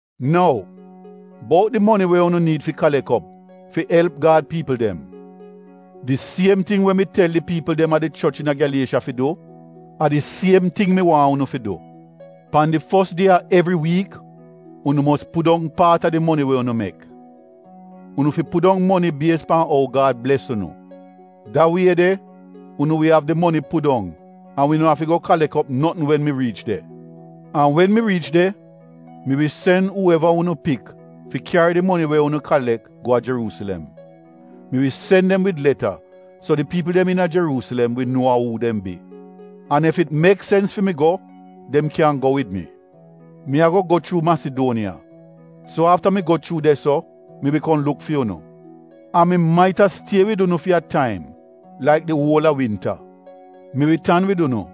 Nou bout di moni we unu niid fi kalek op fi elp Gad piipl dem — di siem ting we mi tel di piipl dem a di choch iina Gyaliesha fi du, a di siem ting mi waahn unu fi du. Pan di fos die a evri wiik, unu mos pudong paat a di moni we unu mek. Unu fi pudong moni bies pan ou Gad bles unu. Da wie de unu wi av di moni pudong an wi no afi go kalek op notn wen mi riich de. An wen mi riich de, mi wi sen uu eva unu pik fi kyari di moni we unu kalek go a Jeruusilem. Mi wi sen dem wid leta so di piipl dem iina Jeruusilem wi nuo a uu dem bi. An ef it mek sens fi mi go, dem kyan go wid mi. Mi ago go chuu Masiduoniya, so afta mi go chuu de-so mi wi kom luk fi unu. An mi maita stie wid unu fi a taim, laik di uol a winta. Mi wi tan wid unu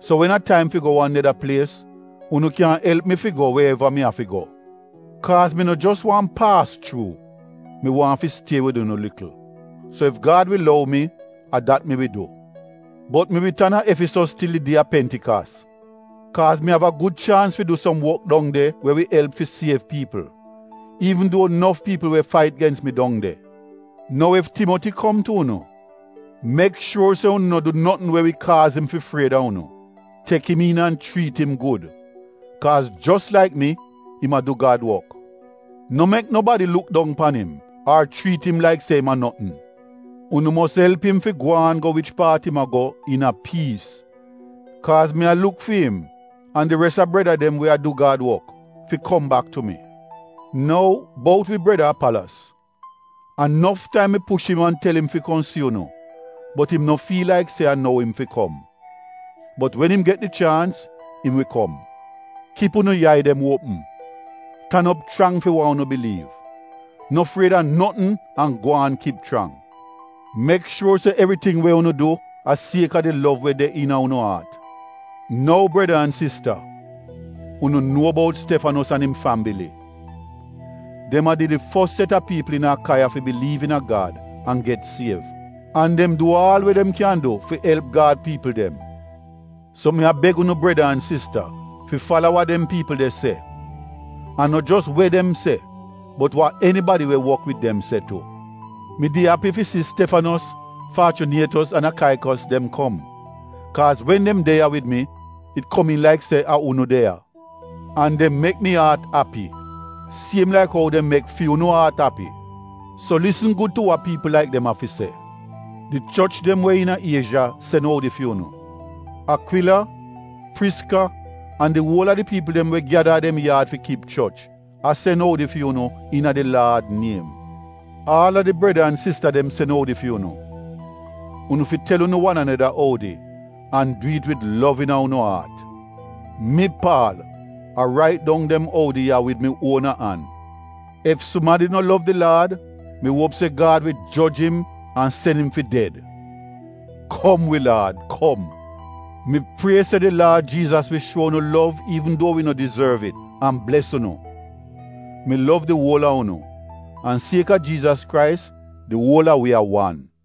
so wen a taim fi go wan neda plies — unu kyan elp mi fi go we eva mi afi go. Kaaz mi no jos waahn paas chuu, mi waahn fi stie wid unu likl. So ef Gad wi lou mi, a dat mi wi du. Bot mi wi tan a Efisos til di die a Pentikas, kaaz mi av a gud chaans fi du som wok dong de we wi elp fi siev piipl, iivn duo nof piipl we fait gens mi dong de. Nou ef Timoti kom tu unu, mek shuor se unu no du notn we wi kaaz im fi fried a unu. Tek im iin an chriit im gud, kaaz jos laik mi, im a du Gad wok. No mek nobadi luk dong pan im ar chriit im laik se im a notn. Unu mos elp im fi gwaan go wich paat im ago iina a piis, kaaz mi a luk fi im an di res a breda dem we a du Gad wok, fi kom bak tu mi. Nou bout wi breda Apalos, a nof taim mi push im an tel im fi kom si unu bot im no fiil laik se a nou im fi kom. Bot wen im get di chaans, im wi kom. Kip unu yai dem uopm, tan op chrang fi wa unu biliiv, no fried a notn an gwaan kip chrang. Mek shuo se evriting we unu du, a kaaz a di lov we de iina unu aat. Nou breda an sista, unu nuo bout Stefanos an im fambili. Dem a did di fos set a piipl iina Akaiya fi biliiv iina Gad an get siev. An dem du aal we dem kyan du fi elp Gad piipl dem. So mi a beg unu breda an sista fi fala wa dem piipl de se, an no jos we dem se bot wa enibadi we wok wid dem se tu. Mi did api fi si Stefanos, Faachyunietos an Akaikos dem kom, kaaz wen dem de ya wid mi it komiin laik se a unu de ya. An dem mek mi aat api siem laik ou dem mek fi unu aat api. So lisn gud tu wa piipl laik dem av fi se. Di choch dem we iina Iezha sen oudi fi unu. Akwila, Priska an di uol a di piipl dem we gyada a dem yaad fi kip choch a sen oudi fi unu iina di Laad niem. Aal a di breda an sista dem sen oudi fi unu. Unu fi tel unu wan aneda oudi an du it wid lov iina unu aat. Mi Paal a rait dong dem oudi ya wid mi uona an. Ef sumadi no lov di Laad, mi uop se Gad wi joj im an sen im fi ded. Kom wi Laad Kom! Mi prie se di Laad Jiizas wi shuo unu lov an bles unu. Mi lov di uol a unu, an sieka Jiizas Krais di uol a wi a wan.